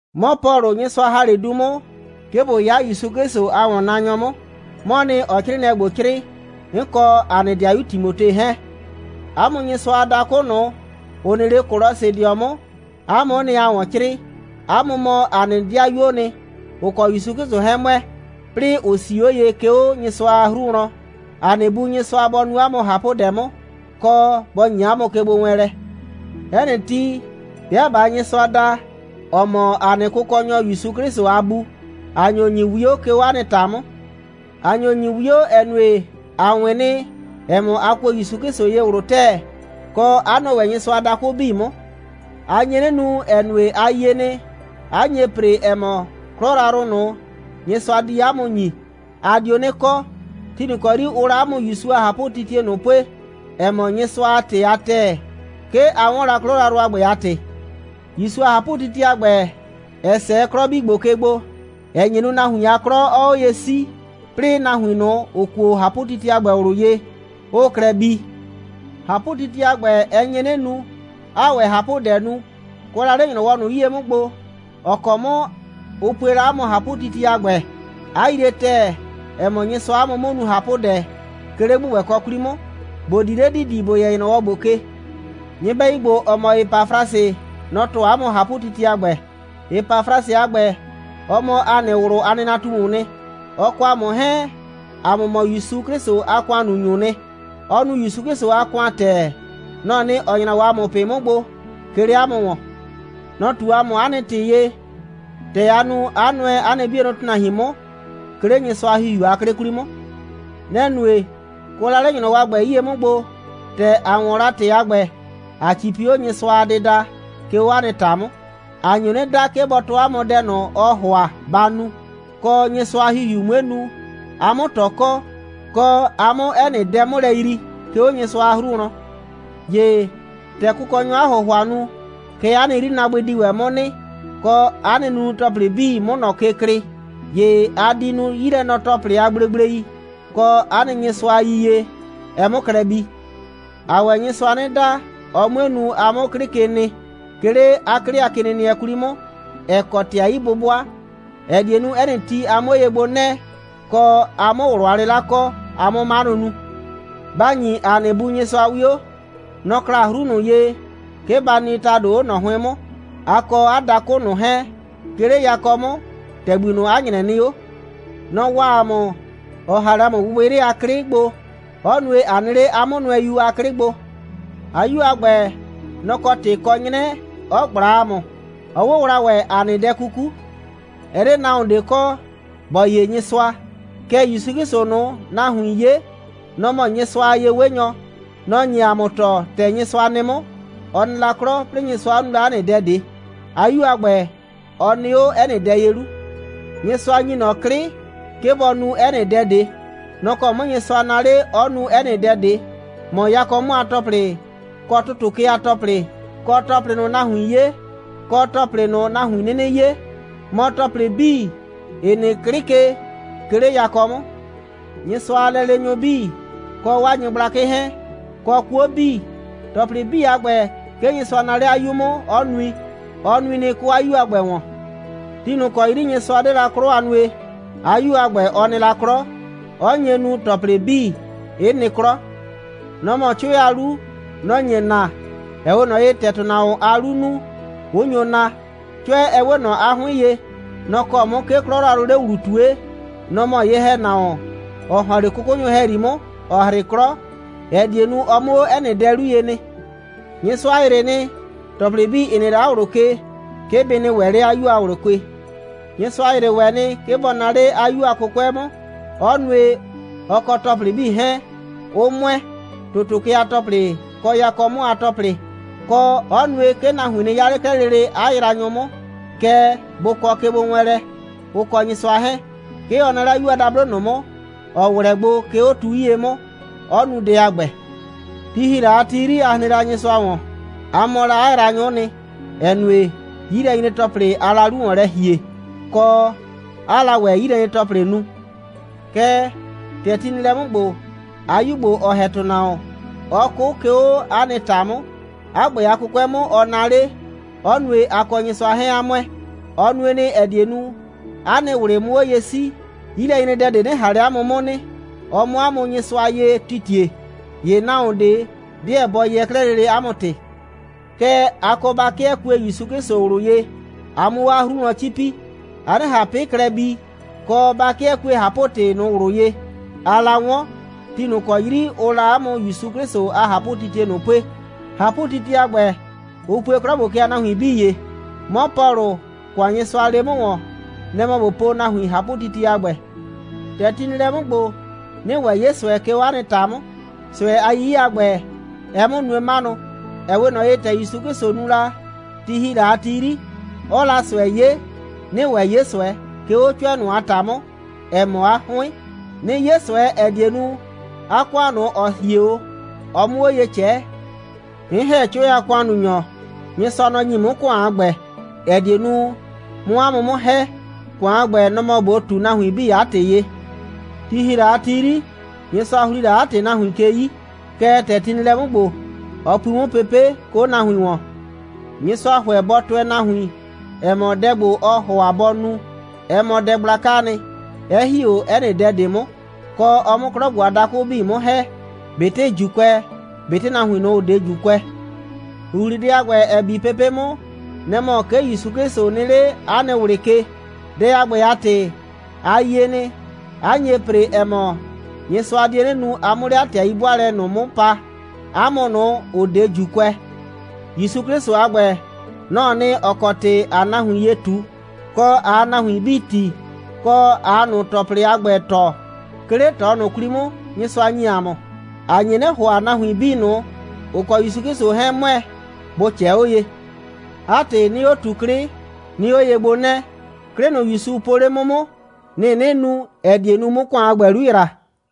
'Mɔ Pɔlʋ, Nyɩsʋa ‑ha 'le du 'mʋ, 'ke ꞊bo 'ya ‑Yusu 'Klɩsʋ a ‑wɔnnaanyɔ 'mʋ, 'mɔɔ nɩ, ‑ɔɔ 'crɩɩnɩɛ ‑gbo 'crɩɩ, 'n kɔ ‑a nɩ 'dɩayu Timote 'hɛɛn. 'A mʋ Nyɩsʋa a dakʋ ꞊nʋ, ‑ʋ nɩ 'le Kolɔsɩdɩɔ 'mʋ, 'a mʋ'ʋ nɩ, ‑aa ‑wɔn 'crɩɩ. 'A mʋ mɔ ‑a nɩ 'dɩayuoo nɩ, ‑ʋ kɔ ‑Yusu 'Klɩsʋ 'hɛɛn ‑mʋɛ, 'plɩɩ ‑ʋ 'sii 'o ye, 'ke 'o Nyɩsʋa a 'hru wlɔn. ‑A nɩ Bu Nyɩsʋa bɔ nu 'a mʋ ꞊hapʋdɛ 'mʋ, kɔ, bɔ ‑nyi 'a mʋ kegbowɛɛnlɛ. 'Ɛ nɩ ti, 'bɩa ꞊baa Nyɩsʋa da, ‑ɔ mɔ ‑a nɩ Kʋkɔnyɔ ‑Yusu 'Klɩsʋ a Bu, ‑a nyo ‑nyi 'wio, 'ke 'o 'a nɩ ‑ta 'mʋ. ‑A nyo ‑nyi 'wio, ‑ɛ nue, ‑a 'wɩn nɩ, ‑ɛ mɔ, a kuo ‑Yusu 'Klɩsʋ ye ꞊wlʋ ‑tɛɛ, kɔ, 'a nʋɛ ‑wɛ Nyɩsʋa a dakʋ 'bii 'mʋ. A nye 'nɩ nu, ‑ɛ nue, a yie nɩ, 'a nye ‑pre, ‑ɛ mɔ, 'klɔ yrayrʋ ꞊nʋ, Nyɩsʋa di 'a mʋ ‑nyi, a dio 'nɩ kɔ. Ti ꞊nʋ ‑kɔ 'yri ʋʋ la 'a mʋ ‑Yusu a ꞊hapʋtitie ꞊nʋ pue, ‑ɛ mɔ Nyɩsʋa a ‑tɩ a ‑tɛɛ, 'ke a 'wɔn la 'klɔ yrayrʋ a ‑gbɛ a ‑tɩ. ‑Yusu a ꞊hapʋtitie a ‑gbɛ, ɛ 'sɛɛ 'klɔ 'bii ‑gbo ke gbo, 'ɛ nye nu, nahuin a 'klɔ 'ɔɔ 'o ye 'sii, 'plɩɩ nahuin ꞊nʋ, ‑ʋ kuo ꞊hapʋtitie a ‑gbɛ ꞊wlʋ ye, 'ʋʋ klɛ bii. ꞊Hapʋtitie a ‑gbɛ, ɛ nye 'nɩ nu, 'aa ‑wɛ ꞊hapʋdɛ nu, kʋɛ la 'le ‑nyrɔwɔ ꞊nʋ 'yie 'mʋ gbo, ‑ɔ kɔ 'mʋ ʋ pue la 'a mʋ ꞊hapʋtitie a ‑gbɛ, 'a yrie ‑tɛɛ, ‑ɛ mɔ, Nyɩsʋaa 'a mʋ 'mʋ nu ꞊hapʋdɛ, 'ke 'le ‑gbʋgbɛkɔ 'kwli 'mʋ, ‑bo di 'le ‑didi, ‑bo yɛ ‑nyrɔwɔ ‑gbo ke. Nyɩbɛyu ‑gbo, ‑ɔ mɔ Epafrasɩ, nɔ‑ tɔɔ 'a mʋ ꞊hapʋtitie a ‑gbɛ. Epafrasɩ a ‑gbɛ, ɔ mɔ ‑a nɩ ꞊wlʋ a nɩnatumuu nɩ. Ɔ kɔ ‑a mʋ 'hɛɛn, ‑a mʋ mɔ ‑Yusu 'Klɩsʋ a ‑kʋannunyʋʋ nɩ. Ɔɔ nu ‑Yusu 'Klɩsʋ a ‑kʋan ‑tɛɛ. Nɔ‑ɔ nɩ, ‑ɔ nyra 'o ‑a mʋ ꞊pɩ 'mʋ gbo, 'ke 'le 'a mʋ ‑wɔn. Nɔ‑ ꞊tu ‑a mʋ 'a nɩ ‑tɩ ye, ‑tɛ aa nu, 'a nʋɛ 'a nɩ 'bienʋ ‑tʋnahuin 'mʋ, 'ke 'le Nyɩsʋa a ‑Hihiu a 'klɩ 'kwli 'mʋ. Nɛ‑ nue, kʋɛ la 'le ‑nyrɔwɔ a ‑gbɛ 'yie 'mʋ gbo, ‑tɛ ‑a 'wɔn la ‑tɩ a ‑gbɛ, ꞊a 'cipi 'o Nyɩsʋa a dɩda, 'ke 'o 'a nɩ ‑ta 'mʋ. ‑A nyo 'nɩ da, 'ke bɔ tɔɔ 'a mʋ dɛ ꞊nʋ, ɔɔ ‑hʋa ba nu, kɔ, Nyɩsʋa a ‑Hihiu 'mue nu, a 'mʋ ꞊tɔ kɔ, kɔ, a 'mʋ 'ɛ nɩ dɛ 'mʋ lɛ yrii, 'ke 'o Nyɩsʋa a 'hru wlɔn. ‑Ye, ‑tɛ Kʋkɔnyɔɔ 'a ‑hʋhʋa nu, kɛ 'a nɩ 'yrinaabʋɩ di ‑wɛ 'mʋ nɩ, kɔ, 'a nɩ nunu‑tɔplɩ 'bii 'mʋ ꞊nɔ ke klɩɩ. ‑Ye a di nu 'yilɛnɔ‑tɔplɩ a gblegblei, kɔ, 'a nɩ Nyɩsʋa a yiyie, ɛ 'mʋ klɛ bii. ‑Aa ‑wɛ Nyɩsʋa 'nɩ da, ɔ 'mue nu, a 'mʋ 'klɩ ke nɩ, 'ke 'le 'a 'klɩ a kenɩnɩɛ ꞊nʋ 'kwli 'mʋ, ‑ɛ kɔ ‑tɩ a 'yi'bʋbʋa, ‑ɛ die nu, 'ɛ nɩ ti, a 'mʋ 'o ye gbo 'nɛɛ, kɔ, a 'mʋ ꞊wlʋ a 'lɩla kɔ, a 'mʋ 'manʋ nu. Ba ‑nyi ‑a nɩ Bu Nyɩsʋa 'wio. Nɔ‑ kla 'hru ꞊nʋ ye, 'ke ba nɩ ‑tado 'o ꞊nɔ 'hʋɩn 'mʋ, a kɔ 'a dakʋ ꞊nʋ 'hɛɛn, 'ke 'le yakɔ 'mʋ, ‑tɛgbi ꞊nʋ, 'a ‑nyrɛ nɩ 'o. Nɔ‑ waa ‑a mʋ, 'ɔ ‑ha 'le ‑a mʋ gbɩgbɩyrɩ a 'klɩ gbo, 'ɔ nue, ꞊a nɩ 'le 'a 'Mʋnʋɛyu a 'klɩ gbo. 'A 'Yu a ‑gbɛ, nɔ‑ kɔ ‑tɩ kɔ 'nyrɛ 'ɔ ꞊gbla ‑a mʋ, 'ɔ 'wʋwla ‑wɛ ‑a nɩ dɛ 'kuku. Ɛ 'de nahuon ꞊de kɔ, ‑bɔ 'ye Nyɩsʋa. Kɛɛ, ‑Yusu 'Klɩsʋ ꞊nʋ, nahuin 'ye, nɔ‑ mɔ Nyɩsʋa a ye'wenyɔ. Nɔ‑ nye ‑a mʋ tɔɔ, ‑tɛ Nyɩsʋa nɩ 'mʋ. Ɔ nɩ la 'klɔ, 'plɩɩ Nyɩsʋa 'ɔ nu la 'ɛ nɩ dɛ ꞊de. 'A 'Yu a ‑gbɛ, ɔ nɩ 'o 'ɛ nɩ dɛ ye 'lu. Nyɩsʋa ‑nyi ꞊nɔ 'klɩ, 'ke bɔ nu 'ɛ nɩ dɛ ꞊de. Nɔ‑ kɔ 'mʋ Nyɩsʋa naa 'le, 'ɔ nu 'ɛ nɩ dɛ ꞊de, mɔ yakɔ 'mʋ a ‑tɔplɩ, kɔ ‑tʋtʋ ke a ‑tɔplɩ, kɔ ‑tɔplɩ ꞊nʋ, nahuiin 'ye, kɔ ‑tɔplɩ ꞊nʋ, nahuin 'nɩnɩ 'ye, mɔ ‑tɔplɩ 'bii, ‑ɩ nɩ 'klɩ ke, 'ke 'le yakɔ 'mʋ, Nyɩsʋa a lɛleenyʋ 'bii, kɔ 'waa nyɩgblakɩ 'hɛɛn, kɔ 'kuo 'bii. ‑Tɔplɩ 'bii a ‑gbɛ, 'ke Nyɩsʋa naa 'le 'a 'Yu 'mʋ, 'ɔ nui. Ɔ nui nɩ, 'ke 'o 'a 'Yu a ‑gbɛ ‑wɔn. Ti ꞊nʋ ‑kɔ 'yri Nyɩsʋa 'de la 'klɔ a nue, 'a 'Yu a ‑gbɛ, ɔ nɩ la 'klɔ, 'ɔ nye nu, ‑tɔplɩ 'bii 'ɩ nɩ 'klɔ. Nɔ‑ mɔ 'Cʋɛ a 'lu. Nɔ‑ nye naa, ‑ɛ 'we ꞊nɔ ye, ‑tɛ ‑tʋnahuon a 'luu nu, 'ʋ nyo naa. 'Cʋɛ, ɛ 'we ꞊nɔ 'a 'hʋɩn ye. Nɔ‑ kɔ 'mʋ, 'ke 'klɔ yrayrʋʋ 'le ‑wlu ꞊tue. Nɔ‑ mɔ ye‑hɛnahuon, ‑ɔ ‑hɔn 'le 'kʋkʋnyʋ ‑hɛyri 'mʋ, ‑ɔ 'hrɩ 'klɔ, ‑ɛ die nu, ɔ 'mʋ 'o 'ɛ nɩ dɛ ꞊de 'lu ye nɩ. Nyɩsʋa ‑yrɩ nɩ, ‑tɔplɩ 'bii, ‑ɩ nɩ 'le 'a ꞊wlʋ ke, 'ke bɩ nɩ ‑wɛ 'le 'a 'Yu a ꞊wlʋ ke. Nyɩsʋa ‑yrɩ ‑wɛ nɩ, 'ke bɔ naa 'le 'a 'Yu a 'kʋkʋɛ 'mʋ, 'ɔ nue, ɔ kɔ ‑tɔplɩ 'bii 'hɛɛn, 'ʋ ‑mʋɛ, ‑tʋtʋ ke a ‑tɔplɩ, kɔ yakɔ 'mʋ a ‑tɔplɩ, kɔ, 'ɔ nue, 'ke nahuin nɩ 'ya 'le 'klɛɛ lele 'a yraanyʋ 'mʋ, kɛɛ, bʋ kɔ kegbowɛɛnlɛ, ʋ kɔ Nyɩsʋa 'hɛɛn. 'Ke ɔ naa 'le 'a 'Yu a dablo ꞊nʋ 'mʋ, ‑ɔ 'wlɛ gbo, 'ke 'o tu 'yie 'mʋ, 'ɔ nu dɛ a ‑gbɛ. Ti ‑hi la a ti 'yri, a hren la Nyɩsʋa ‑wɔn. A mɔ la 'a yraanyʋ'ʋ nɩ, ‑ɛ nue, 'yilɛnyre‑tɔplɩ aa la 'lu ‑wɔn lɛ ‑hie, kɔ, 'aa la ‑wɛ 'yilɛnyre‑tɔplɩ nu. Kɛɛ, ‑tɛ ti nɩ lɛ 'mʋ ‑gbo, 'a 'Yu ‑gbo, ɔ ‑hɛ ‑tʋnahuon, 'ɔ 'kʋ, 'ke 'o 'a nɩ ‑ta 'mʋ, 'a ‑gbɛ a 'kʋkʋɛ 'mʋ, 'ɔ naa 'le, 'ɔ nue, a kɔ Nyɩsʋa 'hɛɛn 'a ‑mʋɛ. Ɔ nue nɩ, ‑ɛ die nu, 'a nɩ ꞊wlɩ 'mʋ 'o ye 'sii, 'yilɛnyredɛ ꞊de 'nɩ ꞊han 'le 'a mʋ 'mʋ nɩ, ɔ 'mʋ 'a mʋ Nyɩsʋa ye titie. ‑Ye nahuon ꞊de 'deɛ bɔ yɛɛ 'klɛɛ lele 'a mʋ ‑tɩ. Kɛɛ, a kɔ ba 'kɩɛ kue ‑Yusu 'Klɩsʋ ꞊wlʋ ye, a 'mʋ 'o 'a 'hru wlɔn 'cipi, a 'nɩ ꞊han 'pɩ klɛ bi, kɔ, ba 'kɩɛ kue ꞊hapʋ‑tɩ ꞊nʋ ꞊wlʋ ye, aa la 'wɔn, ti ꞊nʋ ‑kɔ 'yri ʋʋ la 'a mʋ ‑Yusu 'Klɩsʋ a ꞊hapʋtitie ꞊nʋ pue. ꞊Hapʋtitie a ‑gbɛ, ʋ pue 'klɔ ‑gbo ke a nahuin 'bii ye. 'Mɔ Pɔlʋ, ‑kʋan, Nyɩsʋa lee 'mʋ ‑wɔn, nɛ‑ mɔ ꞊bo pue nahuin ꞊hapʋtitie a ‑gbɛ. ‑Tɛ ti nɩ lɛ 'mʋ ‑gbo, 'nɩɩ ‑wɛ 'ye ꞊sʋɛ, 'ke 'o 'a nɩ ‑ta 'mʋ, ꞊sʋɛ a 'yiye a ‑gbɛ, ɛɛ 'mʋ nue 'manʋ. ‑Ɛ 'we ꞊nɔ ye, ‑tɛ ‑Yusu 'Klɩsʋ nu la, ti ‑hi la a ti 'yri, 'ɔɔ la ꞊sʋɛ 'ye, 'nɩɩ ‑wɛ 'ye ꞊sʋɛ, 'ke 'o 'Cʋɛ ꞊nʋ a ‑ta 'mʋ, ‑ɛ mɔ 'a 'hʋɩn. 'Nɩɩ 'ye ꞊sʋɛ, ‑ɛ die nu, 'a ‑kʋan ꞊nʋ, ‑ɔ hie 'o, ɔ 'mʋ 'o ye ꞊cɛɛ. 'N ‑hɛ 'Cʋɛ a ‑kʋannunyɔ. Nyɩsʋa, nɔ‑ ‑nyi 'mʋ ‑kʋan a ‑gbɛ, ‑ɛ die nu, 'mʋ 'a mʋ 'mʋ ‑hɛ. ‑Kʋan a ‑gbɛ, nɔ‑ mɔ ꞊bo ꞊tu nahuin 'bii 'a ‑tɩ ye. Ti ‑hi la a ti 'yri, Nyɩsʋa ‑hli la 'a ‑tɩ nahuin ke 'yi, kɛɛ, ‑tɛ ti nɩ lɛ 'mʋ ‑gbo, ɔ pui 'mʋ pepe', 'ke 'o 'a nahuin ‑wɔn. Nyɩsʋa ‑hʋɛ bɔ tʋɛ 'a nahuin, ‑ɛ mɔ, dɛ ‑gbo, ɔɔ ‑hʋa bɔ nu, ɛ mɔ dɛ gblakaa nɩ, 'ɛ ‑hi 'o 'ɛ nɩ dɛ ꞊de 'mʋ, kɔ, ɔ 'mʋ 'klɔ ‑gbo a dakʋ 'bii 'mʋ ‑hɛ, ꞊betɩ ‑Juukʋɛ, ꞊betɩ nahuin ꞊nʋ, ‑ʋ 'de ‑Juukʋɛ. ‑Huhlidɛ a ‑gbɛ, ‑ɛ bi pepe' 'mʋ, nɛ‑ mɔ, 'ke ‑Yusu 'Klɩsʋ nɩ 'le 'a nɩ ꞊wlɩ ke. Dɛ a ‑gbɛ a ‑tɩ, a yie nɩ, 'a nye ‑pre, ‑ɛ mɔ, Nyɩsʋa die 'nɩ nu, a 'mʋ 'le 'a ‑tɩ a 'yi'bʋaalɛ ꞊nʋ 'mʋ pa, 'a mʋ ꞊nʋ, ‑ʋ 'de ‑Juukʋɛ. ‑Yusu 'Klɩsʋ a ‑gbɛ, nɔ‑ɔ nɩ, ‑ɔ kɔ ‑tɩ ‑aa nahuin ye ꞊tu, kɔ, ꞊aa nahuin 'bii tii, kɔ, ꞊aa ꞊nʋ ‑tɔplɩ a ‑gbɛ tɔɔ, 'ke 'le ꞊tɔ ꞊nʋ 'kwli 'mʋ, Nyɩsʋa ‑nyi ‑a mʋ. ‑A nye 'nɩ ‑hʋa, nahuin 'bii ꞊nʋ, ‑ʋ kɔ ‑Yusu 'Klɩsʋ 'hɛɛn ‑mʋɛ, bʋ ꞊cɛɛ 'o ye. 'A ‑tɩ, 'nɩɩ 'o ꞊tu 'klɩ, 'nɩɩ 'o ye gbo 'nɛɛ. 'Klɩ ꞊nʋ, ‑Yusu 'Klɩsʋ po 'le 'mʋ 'mʋ, nɩ‑ 'nɩɩ nu, ‑ɛ die nu, 'mʋ ‑kʋan a ‑gbɛ 'lu ‑yra.